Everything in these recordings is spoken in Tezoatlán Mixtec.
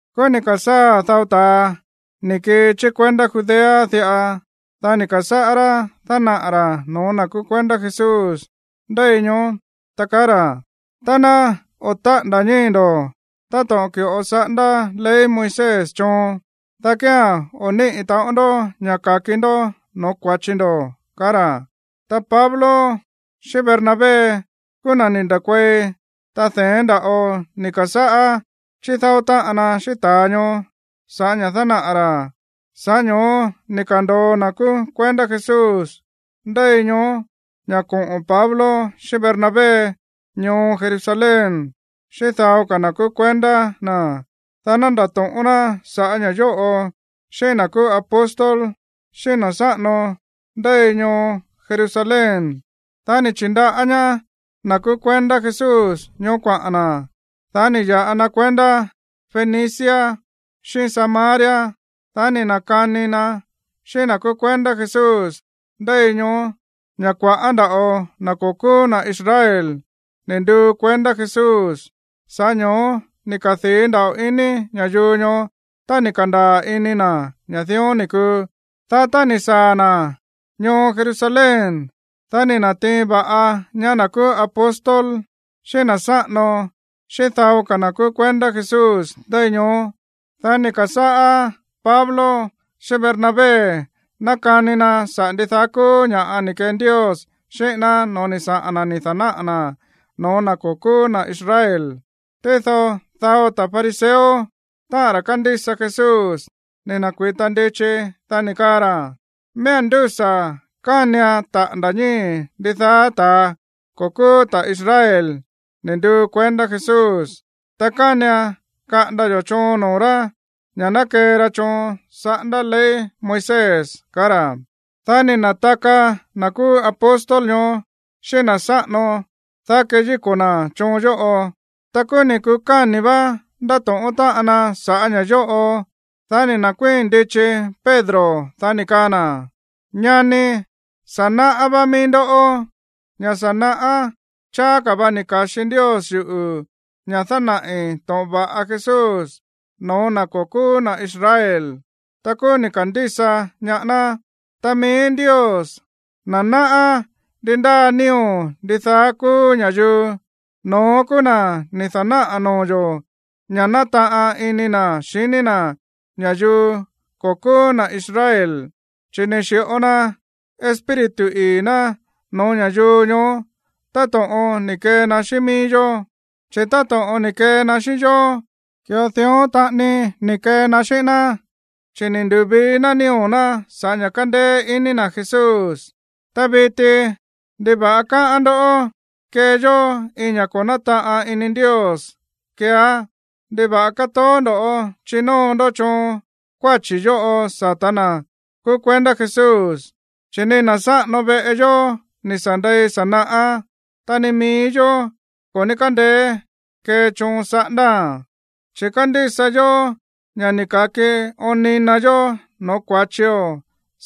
Kúú ni̱ ka̱sáa̱ dao ta̱a ni̱ kii chí kuendá Judea diꞌa. Dá ni̱ ka̱sáꞌá rá dánaꞌa̱ ra̱ no̱ó na̱ kúú kuendá Jesús ndéi ñoó, ta kaá ra̱: ―Tá ná o̱ táꞌa̱nda̱ ñíi̱ ndo̱ táto̱ꞌon ki̱ꞌo saꞌándá ley Moisés choon, dá kía̱n o̱ níꞌi̱ taꞌon ndó ña̱ ka̱ki ndó no̱ó kua̱chi ndo̱ ―kaá ra̱. Ta Pablo xíꞌín Bernabé kúú na̱ ni̱ nda̱kuei, ta de̱én nda̱ꞌo ni̱ ka̱sáꞌá chídáó táꞌan na xíꞌín ta̱a ñoó sa̱ꞌá ña̱ dánaꞌa̱ ra̱. Sa̱ꞌá ño̱ó ni̱ ka̱ndo̱o na̱ kúú kuendá Jesús ndéi ñoó ña̱ koꞌo̱n Pablo xíꞌín Bernabé ñoo Jerusalén xíꞌín dao ka̱ na̱ kúú kuendá na̱, dá ná ndatóꞌón ná sa̱ꞌá ña̱ yóꞌo xíꞌín na̱ kúú apóstol, xíꞌín na̱ sáꞌano ndéi ñoo Jerusalén. Dá ni̱ chi̱ndaꞌá ñaá na̱ kúú kuendá Jesús ñoó kuaꞌa̱n na̱. Dá ni̱ ya̱ꞌa na kuendá Fenicia xíꞌín Samaria. Dá ni̱ na̱kani na xíꞌín na̱ kúú kuendá Jesús ndéi ñoó ña̱ kua̱ꞌá nda̱ꞌo na̱ ko̱ kúú na̱ Israel ni̱ nduu kuendá Jesús. Sa̱ꞌá ño̱ó ni̱ kadii̱ nda̱ꞌo ini ña̱yuu ñoó tá ni̱ ka̱ndaa̱ ini na̱ ña̱ dión ni̱ kuu. Dá tá ni̱ saa̱ na̱ ñoo Jerusalén, dá ni̱ na̱tiin va̱ꞌa ñaá na̱ kúú apóstol, xíꞌín na̱ sáꞌano xíꞌín dao ka̱ na̱ kúú kuendá Jesús ndéi ñoó. Dá ni̱ ka̱sáꞌá Pablo xíꞌín Bernabé nákani na saꞌa̱ ndidaá kúú ña̱ꞌa ni̱ kee Ndios xíꞌín ná no̱ó ni̱ saꞌa̱n na̱ ni̱ da̱náꞌa̱ na̱ no̱ó na̱ ko̱ kúú na̱ Israel. Tído dao ta̱ fariseo, táꞌa̱n ra̱ kándísa Jesús, ni̱ na̱kui̱ta ndichi. Dá ni̱ kaa ra̱: ―Miía̱n ndúsa̱ kánian taꞌa̱nda̱ ñíi̱ ndidaá ta̱a ko̱ kúú ta̱ Israel ni̱ nduu kuendá Jesús, ta kánian kaꞌanda yo̱ choon noo̱ rá ña̱ ná kee ra choon saꞌándá ley Moisés ―kaá ra̱. Dá ni̱ na̱taka na̱ kúú apóstol ñoó xíꞌín na̱ sáꞌano, dá keyíko̱ na̱ choon yóꞌo. Ta kúú ni̱ kukáni̱ vá ndátóꞌón táꞌan na sa̱ꞌá ña̱ yóꞌo. Dá ni̱ nda̱kuíi̱n ndichi Pedro, dá ni̱ kaa na̱: ―Ñani, sa̱ náꞌá vá mií ndó ña̱ sa̱ naꞌá cháá ka̱ va ni̱ ka̱xi Ndios yuꞌu̱ ña̱ dánaꞌi̱ to̱ꞌon va̱ꞌa Jesús no̱ó na̱ ko̱ kúú na̱ Israel. Ta kúú ni̱ ka̱ndísa ñaá ná. Ta mií Ndios, na̱ náꞌá ndi ndáa nío̱ ndidaá kúú ña̱yuu, no̱ón kúú na̱ ni̱ da̱náꞌa̱ noo̱ yo̱ ña̱ nátaꞌan ini na̱ xiní na̱ ña̱yuu ko̱ kúú na̱ Israel, chi̱ ni̱ xi̱ꞌo na Espíritu ii̱ ná no̱ó ña̱yuu ñoó táto̱ꞌon ni̱ kee na xíꞌín mií yó. Chi̱ táto̱ꞌon ni̱ kee na xíꞌín yó, ki̱ꞌo dión taꞌani ni̱ kee na xíꞌín ná, chi̱ ni̱ ndu̱vii na nío̱ ná sa̱ꞌá ña̱ kándéé iní na̱ Jesús. Ta viti, ¿ndiva̱ꞌa káꞌán ndó kee yó iin ña̱ꞌa ko̱ nátaꞌan ini Ndios keeá? ¿Ndiva̱ꞌa kátoó ndo̱ chinóo ndó choon kuáchi̱ yóꞌo sata̱ na̱ kúú kuendá Jesús, chi̱ ni na̱ sáꞌano veꞌe yó ni̱ sa̱ ndei sa̱ naꞌá, ta ni mií yó ko̱ ní kándeé kee choon saꞌándáa̱n? Chi̱ kándísa yó ña̱ ni̱ ka̱ki oon ni na yó no̱ó kua̱chio̱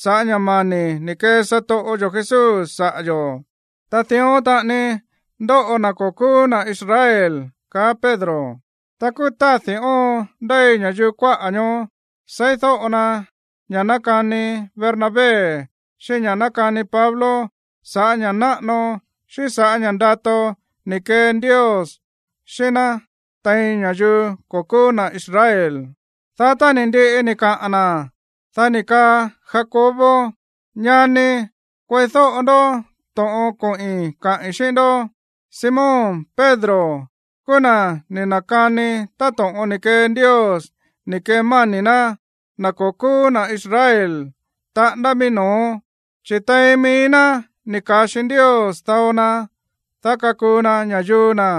sa̱ꞌá ña̱ mani̱ ni̱ kee satoꞌo yo̱ Jesús saꞌa̱ yo̱. Ta dión taꞌani ndóꞌo na̱ ko̱ kúú na̱ Israel ―kaá Pedro. Ta kúú tádi̱ óon ndéi ña̱yuu kuáꞌa̱ ñoó seídóꞌo na ña̱ nákani Bernabé xíꞌín ña̱ nákani Pablo sa̱ꞌá ña̱ꞌa náꞌano xíꞌín sa̱ꞌá ña̱ꞌa ndato ni̱ kee Ndios xíꞌín ná tein ña̱yuu ko̱ kúú na̱ Israel. Dá tá ni̱ ndiꞌi ni̱ kaꞌa̱n na̱, dá ni̱ kaa Jacobo: ―Ñani, kueídóꞌo ndó to̱ꞌon koꞌi̱n kaꞌi̱n xíꞌín ndó. Simón Pedro kúú na̱ ni̱ na̱kani táto̱ꞌon ni̱ kee Ndios ni̱ kemáni̱ ná na̱ ko̱ kúú na̱ Israel taꞌándá mií no̱ó. Chi̱ tein mií ná ni̱ ka̱xi Ndios dao na, dá kakuu na ña̱yuu na̱.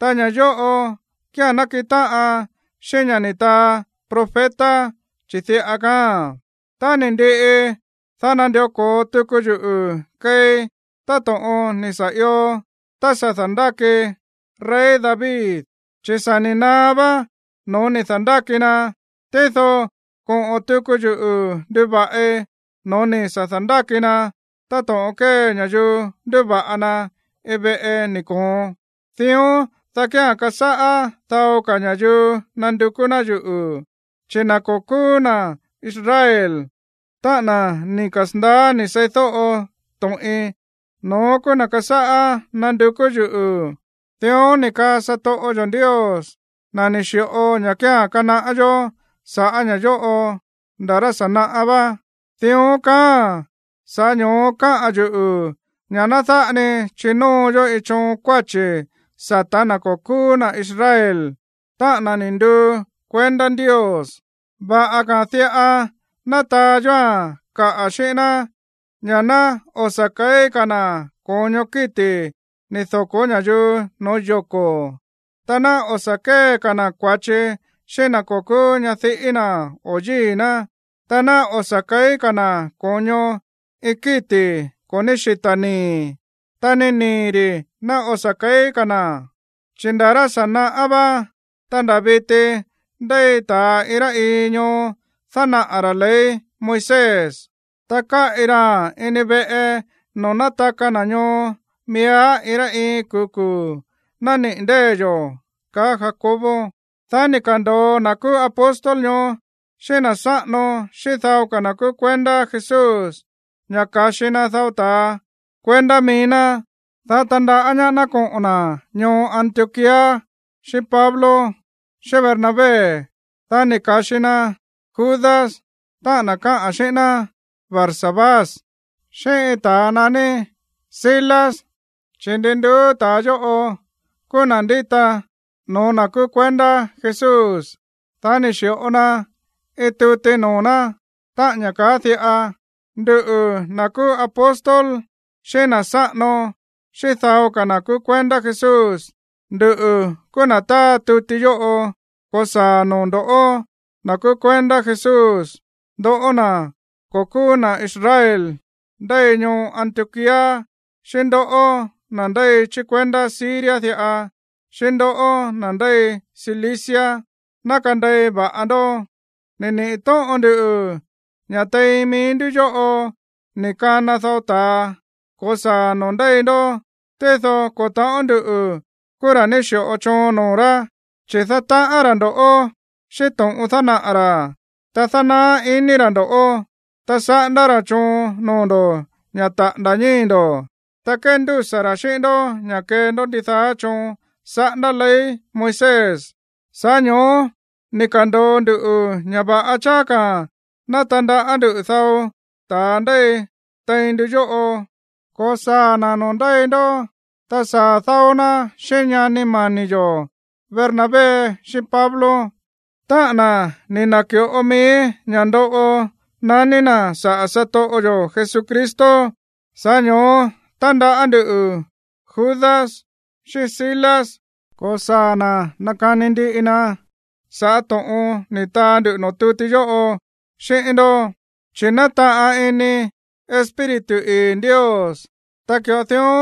Ta ña̱ yóꞌo kía̱n nákiꞌin táꞌan xíꞌín ña̱ ni̱ taa profeta, chi̱ diꞌa kaáa̱n: Tá ni̱ ndiꞌi, dá nandió ko̱o tuku yuꞌu̱ keei táto̱ꞌon ni̱ sa̱ io tá sa̱ da̱ndáki rey David, chi̱ sa̱ ni̱ naá vá no̱ó ni̱ da̱ndáki na. Tído koꞌo̱n tuku yuꞌu̱ nduva̱ꞌi no̱ó ni̱ sa̱ da̱ndáki na, táto̱ꞌon kée ña̱yuu ndúva̱ꞌa na iin veꞌe ni̱ koon. Dión, dá kía̱n kasáꞌá dao ka̱ ña̱yuu nandukú ná yuꞌu̱, chi̱ na̱ ko̱ kúú na̱ Israel, táꞌa̱n na̱ ni̱ kasa̱ndaá ni̱ seídóꞌo to̱ꞌin, no̱ón kúú na̱ kasáꞌá nandukú yuꞌu̱. Dión ni̱ kaa satoꞌo yo̱ Ndios, na̱ ni̱ xi̱ꞌo ña̱ kía̱n kanaꞌá yó sa̱ꞌá ña̱ yóꞌo nda̱ rá sa̱ naꞌá vá. ’Dión kaáa̱n. Sa̱ꞌá ño̱ó kaá yuꞌu̱ ña̱ ná dáꞌa ni chinóo yó iin choon kuáchi̱ sa̱tá na̱ ko̱ kúú na̱ Israel, táꞌa̱n na̱ ni̱ nduu kuendá Ndios. Va̱ꞌa ka̱a̱n diꞌa ná taa yóa̱n kaꞌa̱ xíꞌín ná ña̱ ná o̱ sa̱ ke̱í ka̱ na̱ ko̱ño kíti̱ ni̱ doko̱ ña̱yuu no̱ó yoko̱, ta ná o̱ sa̱ kée ka̱ na̱ kua̱chi xíꞌín na̱ ko̱ kúú ñadiꞌí na̱ o yíi̱ ná, ta ná o̱ sa̱ ke̱í ka̱ na̱ ko̱ño iin kíti̱ ko̱ ní xita̱ nii̱, ta ni nii̱ ri̱ ná o̱ sa̱ ke̱í ka̱ na̱. Chi̱ nda̱ rá sa̱ naꞌá vá, ta nda̱ viti ndéi ta̱a iin rá iin ñoo dánaꞌa̱ ra̱ ley Moisés. Ta káꞌi raa̱n ini veꞌe noo̱ nátaka na̱ ñoo miíá iin rá iin kuu̱ kuu̱ nániꞌi̱ ndée̱ yo̱ ―kaá Jacobo. Dá ni̱ ka̱ndo̱o na̱ kúú apóstol ñoó xíꞌín na̱ sáꞌano xíꞌín dao ka̱ na̱ kúú kuendá Jesús ña̱ ka̱xi na dao ta̱a kuendá mií ná, dá tandaꞌá ñaá ná koꞌo̱n na̱ ñoo Antioquía xíꞌín Pablo xíꞌín Bernabé. Dá ni̱ ka̱xi na Judas, táꞌa̱n na̱ káꞌa̱n xíꞌín ná Barsabás, xíꞌín iin ta̱a naní Silas, chi̱ ndi nduú ta̱a yóꞌo kúú na̱ ndíta no̱ó na̱ kúú kuendá Jesús. Dá ni̱ xi̱ꞌo na iin tuti noo̱ ná, táꞌa̱n ña̱ káꞌa̱n diꞌa: “Nduꞌu̱, na̱ kúú apóstol, xíꞌín na̱ sáꞌano, xíꞌín dao ka̱ na̱ kúú kuendá Jesús, nduꞌu̱ kúú na̱ táa tuti yóꞌo ko̱saa̱a̱n noo̱ ndo̱ꞌó, na̱ kúú kuendá Jesús, ndoꞌó na̱ ko̱ kúú na̱ Israel ndéi ñoo Antioquía, xíꞌín ndoꞌó, na̱ ndéi chí kuendá Siria diꞌa, xíꞌín ndoꞌó, na̱ ndéi Cilicia. Ná kandei va̱ꞌa ndó. Ni̱ niꞌi̱ tóꞌon nduꞌu̱ ña̱ tein mií ndú yóꞌo ni̱ kana dao ta̱a ko̱saa̱ noo̱ ndéi ndó, tído ko̱ ta̱ꞌón nduꞌu̱ kúú ra̱ ni̱ xi̱ꞌo choon noo̱ rá. Chi̱ dátaꞌán ra̱ ndo̱ꞌó xíꞌín to̱ꞌon dánaꞌa̱ ra̱, ta dánaá ini ra̱ ndó, ta saꞌándá ra̱ choon noo̱ ndo̱ ña̱ taꞌa̱nda̱ ñíi̱ ndo̱, ta kéndúsa̱ ra̱ xíꞌín ndó ña̱ kee ndó ndidaá choon saꞌándá ley Moisés. Sa̱ꞌá ño̱ó ni̱ ka̱ndo̱o ndu ña̱ va̱ꞌa cháá ka̱ ná tandaꞌá ndú dao ta̱a ndéi tein ndu yóꞌo ko̱saa̱ na̱ noo̱ ndéi ndó. Ta saa̱ dáó ná xíꞌín ñani mani̱ yo̱ Bernabé xíꞌín Pablo, táꞌa̱n na̱ ni̱ na̱ki̱ꞌo mií ña̱ ndoꞌo naní na̱ saꞌa̱ satoꞌo yo̱ Jesucristo. Sa̱ꞌá ño̱ó tándaꞌá ndú Judas xíꞌín Silas ko̱saa̱ na̱ nakani ndiꞌi na sa̱ꞌá to̱ꞌon ni̱ taa ndu noo̱ tuti yóꞌo xíꞌín ndó. Chi̱ nátaꞌan ini Espíritu ii̱ Ndios, ta ki̱ꞌo dión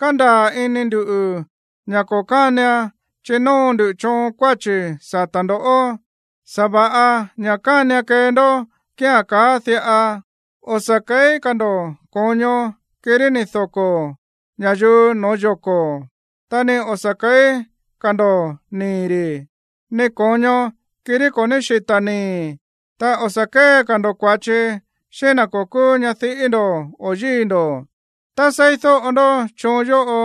kándaa̱ ini ndu̱ ña̱ ko̱ kánian chinóo ndu choon kuáchi̱ sata̱ ndo̱. Sa̱va̱ꞌa ña̱ kánian kee ndó kía̱n kaáa̱n diꞌa: o̱ sa̱ ke̱í ka̱ ndo̱ ko̱ño kirí ni̱ doko̱ ña̱yuu no̱ó yoko̱. Ta ni o̱ sa̱ ke̱í ka̱ ndo̱ nii̱ ri̱, ni ko̱ño kirí ko̱ ní xita̱ nii̱, ta o̱ sa̱ kée ka̱ ndo̱ kua̱chi xíꞌín na̱ ko̱ kúú ñadiꞌí ndo̱ o yíi̱ ndo̱. Tá seídóꞌo ndó choon yóꞌo,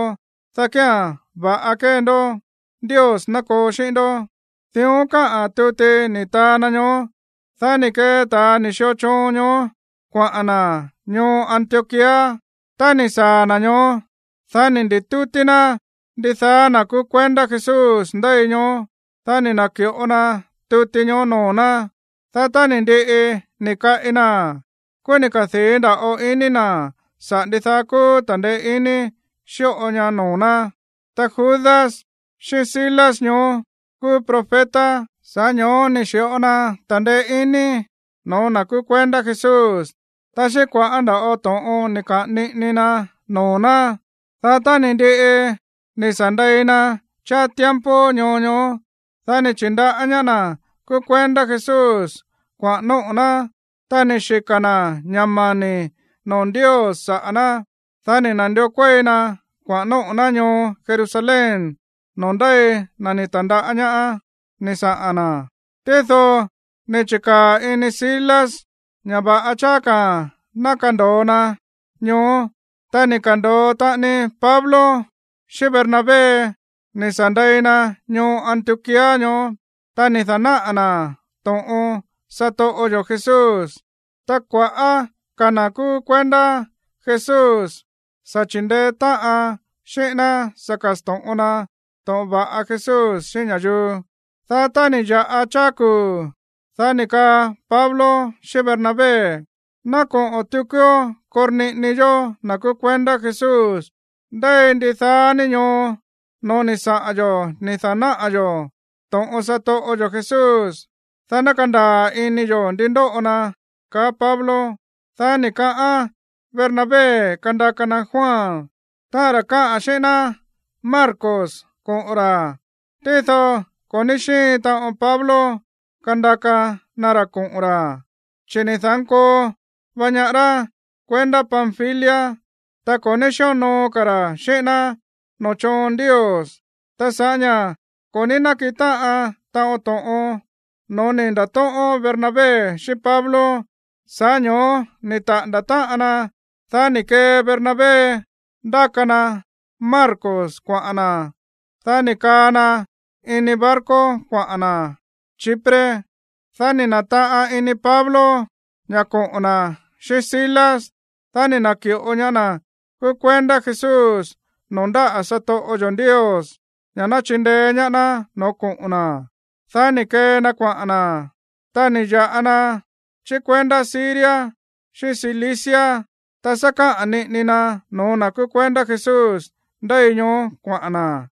dá kía̱n va̱ꞌa kee ndó. Ndios ná koo xíꞌín ndó.” Dión káꞌa̱n tuti ni̱ taa na ñoó. Dá ni̱ kee ta̱a ni̱ xio choon ñoó kuaꞌa̱n na̱ ñoo Antioquía. Tá ni̱ saa̱ na̱ ñoó, dá ni̱ ndi̱tútí ná ndidaá na̱ kúú kuendá Jesús ndéi ñoó. Dá ni̱ na̱ki̱ꞌo na tuti ñoó noo̱ ná. Dá tá ni̱ ndiꞌi ni̱ kaꞌi naa̱n, kúú ni̱ kadii̱ nda̱ꞌo ini na̱ saꞌa̱ ndidaá kúú ta̱ndeé iní xíꞌo ña noo̱ ná. Ta Judas xíꞌín Silas ñoó kúú profeta, sa̱ꞌá ño̱ó ni̱ xi̱ꞌo na ta̱ndeé iní no̱ó na̱ kúú kuendá Jesús, ta xíꞌín kua̱ꞌá nda̱ꞌo to̱ꞌon ni̱ kaꞌa̱n niꞌini ra noo̱ ná. Dá tá ni̱ ndiꞌi ni̱ sa̱ ndei na cháá tiempo ñoo ñoó, dá ni̱ chi̱ndaꞌá ñaá na̱ kúú kuendá Jesús kuaꞌa̱n nóꞌo̱ ná, ta ni̱ xika̱ na̱ ña̱ mani̱ noo̱ Ndios saꞌa̱ ná. Dá ni̱ na̱ndió kuéi na kuaꞌa̱n nóꞌo̱ ná ñoo Jerusalén noo̱ ndéi na̱ ni̱ ta̱ndaꞌá ñaá ni̱ saꞌa̱n na̱. Tído ni̱ chi̱kaa̱ ini Silas ña̱ va̱ꞌa cháá ka̱ ná kando̱o na ñoó. Ta ni̱ ka̱ndo̱o taꞌani Pablo xíꞌín Bernabé ni̱ sa̱ ndei na ñoo Antioquía ñoó, ta ni̱ da̱náꞌa̱ na̱ to̱ꞌon satoꞌo yo̱ Jesús. Ta kua̱ꞌá ka̱ na̱ kúú kuendá Jesús sa̱ chi̱ndeé táꞌan xíꞌín ná sa̱ ka̱sto̱ꞌon na to̱ꞌon va̱ꞌa Jesús xíꞌín ña̱yuu. Dá tá ni̱ ya̱ꞌa cháá kuu̱, dá ni̱ kaa Pablo xíꞌín Bernabé: ―Ná koꞌo̱n tukuó korniꞌini yó na̱ kúú kuendá Jesús ndéi ndidaá ni ñoo no̱ó ni̱ saꞌa̱n yo̱ ni̱ da̱náꞌa̱ yo̱ to̱ꞌon satoꞌo yo̱ Jesús, dá ná kandaa̱ ini yo̱ ndi ndóꞌo na ―kaá Pablo. Dá ni̱ kaꞌán Bernabé kandaka na Juan, táꞌa̱n ra̱ káꞌa̱n xíꞌín ná Marcos, koꞌo̱n ra̱. Tído ko̱ ní xíin taꞌon Pablo kandaka na ra̱ koꞌo̱n ra̱, chi̱ ni̱ da̱nkoo va ñaá rá kuendá Panfilia, ta ko̱ ní xíonoo ka̱ ra̱ xíꞌín ná noo̱ choon Ndios. Ta sa̱ꞌá ña̱ ko̱ ní nákiꞌin táꞌan taꞌon to̱ꞌon no̱ó ni̱ nda̱tóꞌón Bernabé xíꞌín Pablo, sa̱ꞌá ño̱ó ni̱ taꞌa̱nda̱ táꞌan na. Dá ni̱ kee Bernabé ndáka na Marcos kuaꞌa̱n na̱. Dá ni̱ kaa na ini barco kuaꞌa̱n na̱ Chipre. Dá ni̱ na̱taꞌan ini Pablo ña̱ koꞌo̱n na̱ xíꞌín Silas. Dá ni̱ na̱ki̱ꞌo ñaá na̱ kúú kuendá Jesús noo̱ ndáꞌa̱ satoꞌo yo̱ Ndios ña̱ ná chindeé ñaá ná no̱ó koꞌo̱n na̱. Dá ni̱ kee na kuaꞌa̱n na̱. Ta ni̱ ya̱ꞌa na chí kuendá Siria xíꞌín Cilicia, ta sá káꞌa̱n niꞌini na no̱ó na̱ kúú kuendá Jesús ndéi ñoó kuaꞌa̱n na̱.